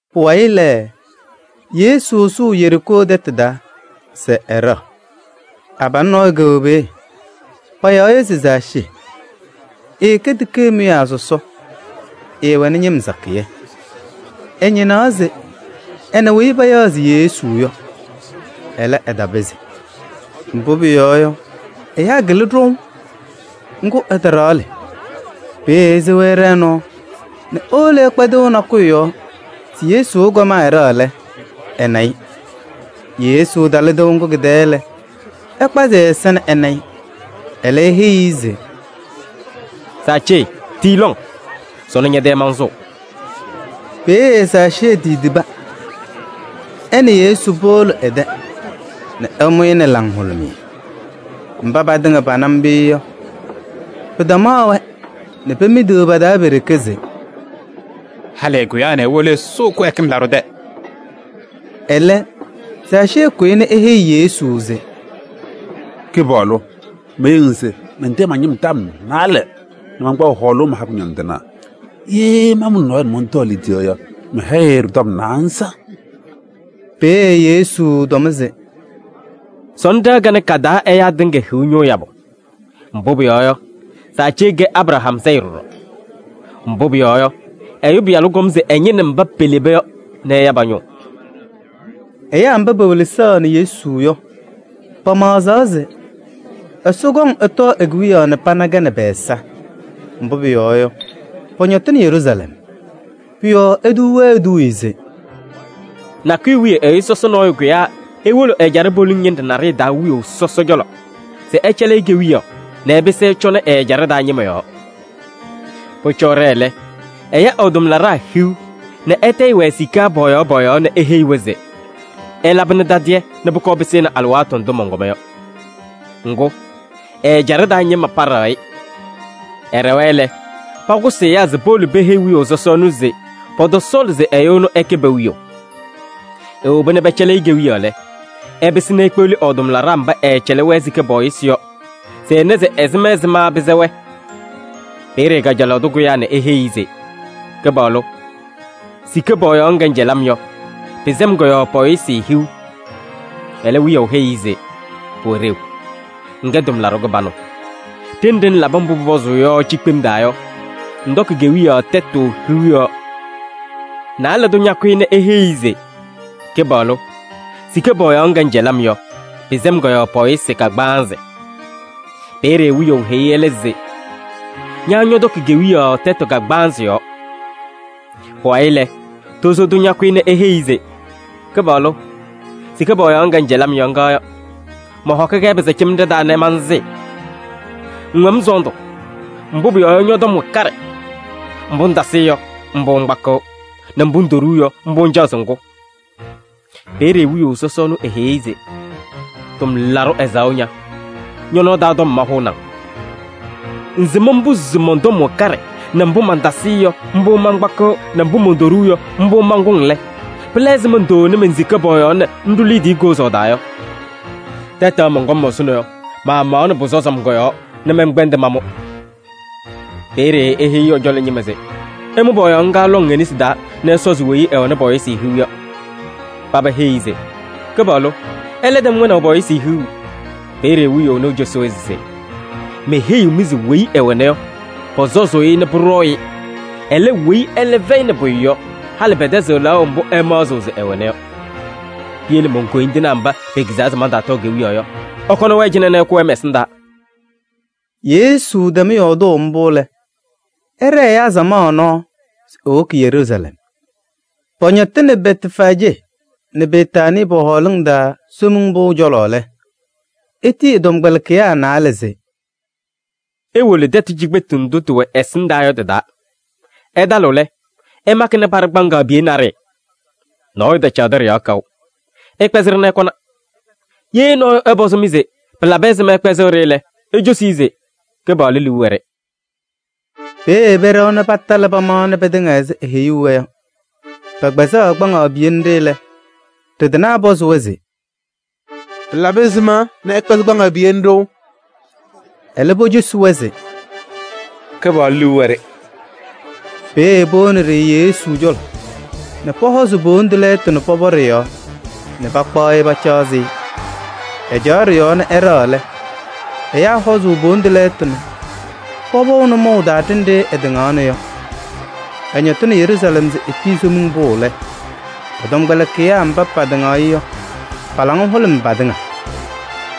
Pʋwayɩ lɛ, Yesu sʋʋ Yeriikoo tɛtʋ taa se ɛɖɛɣ. Abalʋ nɔɔyʋ kɛwɛ peeye, payaɣ-ɩ se Zaacee. Ɛkɛ tikee mʋyaa sɔsɔ, ɛwɛnɩ ñɩm sakɩyɛ. Ɛñɩnaɣ se ɛna weyi payaɣ se Yesu yɔ, ɛlɛ, ɛtapɩzɩ. Mbʋ pʋyɔɔ yɔ, ɛyaa kɩlɩ ɖɔʋ. Ŋgʋ, ɛtaɖaɣlɩ. Peeye esewa ɛɖɛɛ nɔɔ nɛ ewolo ɛkpa tɩʋ nakʋyʋ yɔɔ se Yesu ɛkɔm ɛɖɛɣ lɛ, ɛna-ɩ. Yesu talɩ tɩʋ ŋgʋ kɩ-tɛɛ lɛ, ɛkpazɩ ɛ-ɛza nɛ ɛna-ɩ. Ɛlɛ eheyi-i se: “Zaacee tii lɔŋ! Sɔnɔ ñɛ-tɛ mansʋʋ.” Peeye Zaacee titiba nɛ ɛ nɛ Yesu powolo ɛ-tɛ nɛ ɛmʋ-ɩ nɛ laŋhʋlʋmɩyɛ. Mba patɩŋa pana mbʋ yɔ, pɩtamaɣ-wɛ nɛ pemidiɣ pa-taa pe-ɖeke se: “Halɩ ɛkʋyaa nɛ ewolo ɛsʋʋ kɩwɛɛkɩm laɖʋ tɛ!” Ɛlɛ Zaacee kʋyɩ nɛ eheyi Yesu se: “Kɩpaɣlʋ! Meheyiɣ-ŋ se mantayɩɣ ma-ñɩm tɔm naalɛ nɛ mankpaɣ hɔɔlʋʋ maha kʋñɔndɩnaa. Ye maamuli nɔɔyʋ nɛ mɔntɔɔ e-liidiye yɔ, mɛhɛyɩ-ɩ ɖɩ-tɔm naanza.” Peeye Yesu tɔm se: “Sɔnɔ ɖɩɣa kanɛ ka-taa ɛyaa tɩŋa hiɣ ñʋʋ yabʋ. Mbʋ pʋyɔɔ yɔ, Zaacee kɛ Abraham sayɩ ɖɔɖɔ. Mbʋ pʋyɔɔ yɔ, Ɛyʋ Pɩyalʋ kɔm se ɛñɩnɩ mba peleba yɔ nɛ ɛya pa-ñʋʋ.” Ɛyaa mba pewelesaɣnɩ Yesu yɔ, pamaɣzaɣ se Ɛsɔ tɩkɔŋ ɛtɔɔ e-kewiyaɣ nɛ pana-kɛ nɛ pɛ-ɛza. Mbʋ pʋyɔɔ yɔ, pɔñɔtɩnɩ Yeruusalɛm. Pʋ-yɔɔ etuu-wɛ eduuye se: “Nakʋyʋ wiye ɛyʋ sɔsɔ nɔɔyʋ kʋyaa ewolo ɛjaɖɛ poliŋ ñɩnɖɛ naɖɩyɛ taa wiyaʋ sɔsɔ cɔlɔ se ɛcɛlɩ-ɩ kewiyaɣ nɛ ɛɛpɩsɩ ɛcɔnɩ ɛ-ɛjaɖɛ taa ñɩma yɔɔ. Pʋcɔ ɛɖɛɛ lɛ, ɛya ɛ-tʋmlaɖaa hiu nɛ ɛtayɩ-wɛ sika pɔɔyaɣ pɔɔyaɣ nɛ eheyi-wɛ se: ‘Ɩlabɩnɩ tadɩyɛ nɛ pʋkɔɔ pɩsɩnɩ alɩwaatʋ ndʋ mɔnkɔma yɔ.’ Ŋgʋ, ɛ-ɛjaɖɛ taa ñɩma paɖaɣ-ɩ. Ɛɖɛwa lɛ, pakʋsɩ ɛyaa se powolo peheyi wiyaʋ sɔsɔ ɛnʋ se pɔtɔsɔɔlɩ se ɛyʋ ɛnʋ ɛkɛ pe-wiyaʋ. Ewoba nɛ pɛcɛlɩ-ɩ kewiyaɣ lɛ, ɛpɩsɩ nɛ ekpeɣli ɛ-tʋmlaɖaa mba ɛɛcɛlɩ-wɛ sika pɔɔyɩsɩ yɔ se ɛna se ɛzɩma ɛzɩma pɩsɛ-wɛ. Peeye kajalaɣ tʋ kʋyaa nɛ eheyi-i se: ‘Kɩpaɣlʋ! Sika pɔɔyaɣ ŋga ŋcɛlɩ-m yɔ, pɩsɛ-m kɔ-yɔɔ pɔɔyɩsɩ hiu.’ Ɛlɛ wiyaʋ heyi-i se: ‘Pʋwɛ ɖeu, ŋkɛ tʋmlaɖʋ kɩbanʋ. Ɖenɖe ŋlabɩ mbʋ pʋpɔzʋʋ yɔ cikpem taa yɔ, ŋtɔkɩ kewiyaɣ tɛtʋ hiu yɔɔ.’ Naalɛ tʋ ñakʋyɩ nɛ eheyi-i se: ‘Kɩpaɣlʋ! Sika pɔɔyaɣ ŋga ŋcɛlɩ-m yɔ, pɩsɛ-m kɔ-yɔɔ pɔɔyɩsɩ kagbaanzɩ.’ Peeye wiyaʋ heyi ɛlɛ se: ‘Ña ñɔtɔkɩ kewiyaɣ tɛtʋ kagbaanzɩ yɔɔ.’ Pʋwayɩ lɛ, tozo tʋ ñakʋyɩ nɛ eheyi-i se: ‘Kɩpaɣlʋ! Sika pɔɔyaɣ ŋga ŋcɛlɩ-m yɔ, ŋga yɔ. Mɔhɔkɩ-kɛ pɩsaacemɖe taa nɛ mansɩɩ. Ŋwɛ-m sɔɔndʋ, mbʋ pʋyɔɔ yɔ, ñɔ-tɔm wɛ kaɖɛ. Mbʋ ŋtasɩɩ yɔ, mbʋ ŋkpakɩɣ, nɛ mbʋ ŋtoɖuu yɔ, mbʋ ŋcaɣ se ŋkʋ.’ Peeye wiyaʋ sɔsɔ ɛnʋ eheyi-i se: ‘Tʋmlaɖʋ ɛzaɣʋ ña! Ñɔ-nɔɔ taa tɔm mahʋʋnɩ-ŋ. Ŋsɩm mbʋ se mɔn-tɔm wɛ kaɖɛ nɛ mbʋ mantasɩɩ yɔ, mbʋ mankpakɩɣ nɛ mbʋ montoɖuu yɔ, mbʋ mankʋŋ lɛ, pɩla ɛzɩma ŋtaawoni men-sika pɔɔyaɣ nɛ ŋɖʋ liidiye kozaɣ taa yɔ? Tɛtɛɣ mɔnkɔm ɛzʋnɔ yɔ, maamaɣnɩ pʋsɔzɩ-m kɔ-yɔɔ nɛ mɛnkpɛndɩ mamʋ.’ Peeye eheyi ɛ-cɔlɔ ñɩma se: ‘Ɩmʋ pɔɔyaɣ ŋga lɔŋ e-nesi taa nɛ ɩsɔzɩ weyi ɛwɛnɩ pɔɔyɩsɩ hiu yɔ.’ Paba heyi-i se: ‘Kɩpaɣlʋ! Ɛlɛ tɛm wɛnaʋ pɔɔyɩsɩ hiu!’ Peeye wiyaʋ ɛnʋ ecosi-wɛ se: ‘Meheyiɣ-mɩ se weyi ɛwɛna yɔ, pɔsɔzʋʋ-ɩ nɛ pʋɖɔɔ-ɩ. Ɛlɛ, weyi ɛlɛ fɛyɩnɩ pʋyʋ yɔ, halɩ pɛtɛzɩɣ lɛɣʋ mbʋ ɛmaɣzɩɣ se ɛwɛna yɔ. Piyele mon-koyindinaa mba pekizaa se mantaatɔɔ kewiyaɣ yɔ, ɩkɔnɩ-wɛ cɩnɛ nɛ ɩkʋ-wɛ mɛ-ɛsɩndaa.’” Yesu tɛm yɔɔdʋʋ mbʋ lɛ, ɛɖɛɛ ɛyaa samaɣ nɔɔ se ewoki Yeruusalɛm. Pɔñɔtɩnɩ Bɛtfaajee nɛ Betaanii pɔ-hɔɔlʋʋ taa Somiŋ Pʋʋ cɔlɔ lɛ, etiyi ɛ-tɔmkpɛlɩkɩyaa naalɛ se: “Iwolo tɛtʋ cikpetu nɖʋ tɩwɛ ɛsɩndaa yɔ tɩ-taa. Ɩtalɩɣ lɛ, ɩmakɩnɩ paɖɩ kpaŋaɣ piye naɖɩyɛ. Nɔɔyʋ tacaɣdɩ ɖɩ-yɔɔ kaʋ. Ɩkpɛzɩ-ɖɩ nɛ ɩkɔna. Ye nɔɔyʋ ɛpɔzɩ-mɩ se: ‘Pɩlabɩ ɛzɩma ɩkpɛzɩɣ-ɖɩ’ lɛ, icosi-i se: ‘Kɩpaɣlʋ liu wɛ-ɖɩ.’” Peeye pɛɖɛwa nɛ patalɩ pamaɣnɩ pɩtɩŋa ɛzɩ eeheyuu-wɛ yɔ. Pɛkpɛzaɣ kpaŋaɣ piye nɖɩ lɛ, ɖɩ-tɩnaa pɔzɩ-wɛ se: “Pɩlabɩ ɛzɩma ɩkpɛzɩɣ kpaŋaɣ piye nɖɩ?” Ɛlɛ pocosi-wɛ se: “Kɩpaɣlʋ liu wɛ-ɖɩ.” Peeye powoni-ɖɩ Yesu cɔlɔ nɛ pɔhɔzɩ po-wondu lɛɛtʋ nɛ pɔpɔ ɖɩ-yɔɔ nɛ pakpaɣ-ɩ pacaɣzɩ. Ɛcaɣ ɖɩ-yɔɔ nɛ ɛɖɛɣ lɛ, ɛyaa hɔzʋʋ po-wondu lɛɛtʋ nɛ pɔpɔʋ nʋmɔʋ taa ɖenɖe ɛtɩŋaɣna yɔ. Ɛñɔtɩnɩ Yeruusalɛm ɛzɩ eetii Somiŋ Pʋʋ lɛ, ɛ-tɔmkpɛlɩkɩyaa sakɩyɛ mba patɩŋaɣ-ɩ yɔ, pa-laŋa hʋlʋmɩ patɩŋa.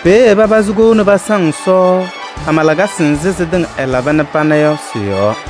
Peeye papazɩ kou nɛ pasaŋ Ɛsɔ, hama lakasɩ nzɩ sɩtɩŋa ɛlaba nɛ pana yɔ sɩ-yɔɔ.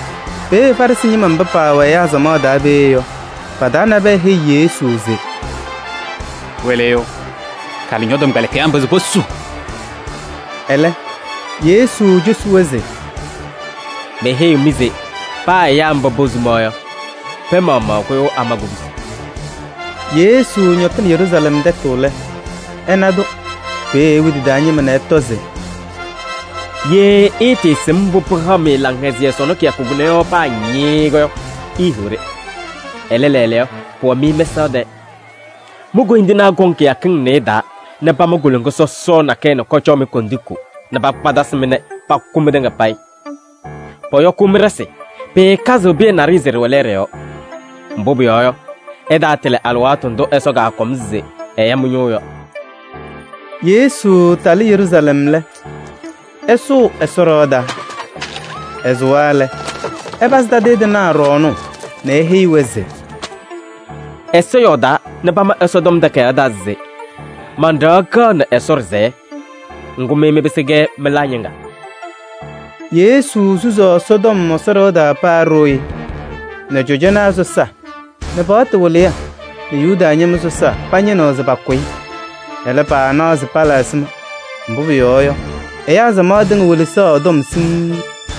Peeye Farɩsɩ ñɩma mba paawɛ ɛyaa samaɣ taa peeye yɔ, pa-taa nabɛyɛ heyi Yesu se: “Wɩlɩyʋ! Kalɩ ñɔ-tɔmkpɛlɩkɩyaa mba se posu.” Ɛlɛ Yesu cosi-wɛ se: “Meheyiɣ-mɩ se paa ɛyaa mba posuma yɔ, pɛɛ maɣmaɣ kʋyʋʋ ama kubusi!” Yesu ñɔtɩnɩ Yeruusalɛm tɛtʋ lɛ, ɛna-tʋ. Peeye ewi tɩ-taa ñɩma nɛ ɛtɔ se: “Ye ɩɩtɩɩsɩm mbʋ pɩhaɣ-mɩ laŋhɛzɩyɛ sɔnɔ kɩyakʋ kʋnɛ yɔ paa ñɩɩɩ yɔ, iihiɣ-ɖɩ! Ɛlɛ, lɛɛlɛɛyɔ, pʋwɛ-mɩ mɛsaɣ tɛɛ. Mi-koyindinaa kɔŋ kɩyakɩŋ nɩɩyɩ taa nɛ pama koloŋa sɔsɔɔ nakɛyɛ nɛ kɔcɔɔ-mɩ kondiko nɛ pakpatasɩ-mɩ nɛ pakʋ mɩtɩŋa payɩ. Pɔyɔkʋʋ mɩ-ɖɩsɩ, pɩɩkazɩɣ pɩyɛ naɖɩyɛ se ɖɩwɛ lɛɛɖɛ yɔɔ. Mbʋ pʋyɔɔ yɔ, ɩtaatɩlɩ alɩwaatʋ ndʋ Ɛsɔ kaakɔm se ɛya mɩ-ñʋʋ yɔ.” Yesu talɩ Yeruusalɛm lɛ, ɛsʋʋ Ɛsɔ ɖɩɣa taa. Ɛsʋwa lɛ, ɛpazɩ tadɩyɛ tɩnaa ɖɔɔnʋʋ nɛ eheyi-wɛ se: “Ɛsɔ yɔɔdaa nɛ pama Ɛsɔtɔm Takayaɣ taa se: ‘Man-ɖɩɣa kɛɣnɩ Ɛsɔ ɖɩsɛyɛ.’ Ŋgʋ, mɩ mɩpɩsɩ-kɛ mɩlaa ñɩŋga.” Yesu susaɣ Ɛsɔtɔm Ɛsɔ ɖɩɣa taa paa ɖooye nɛ cɔjɔnaa sɔsaa nɛ paɣtʋ wɩlɩyaa nɛ Yuda ñɩma sɔsaa pañɩnɩɣ se pakʋ-ɩ. Ɛlɛ, paanaɣ se pala ɛzɩma. Mbʋ pʋyɔɔ yɔ, ɛyaa samaɣ tɩŋa welesaɣ ɛ-tɔm siŋŋ.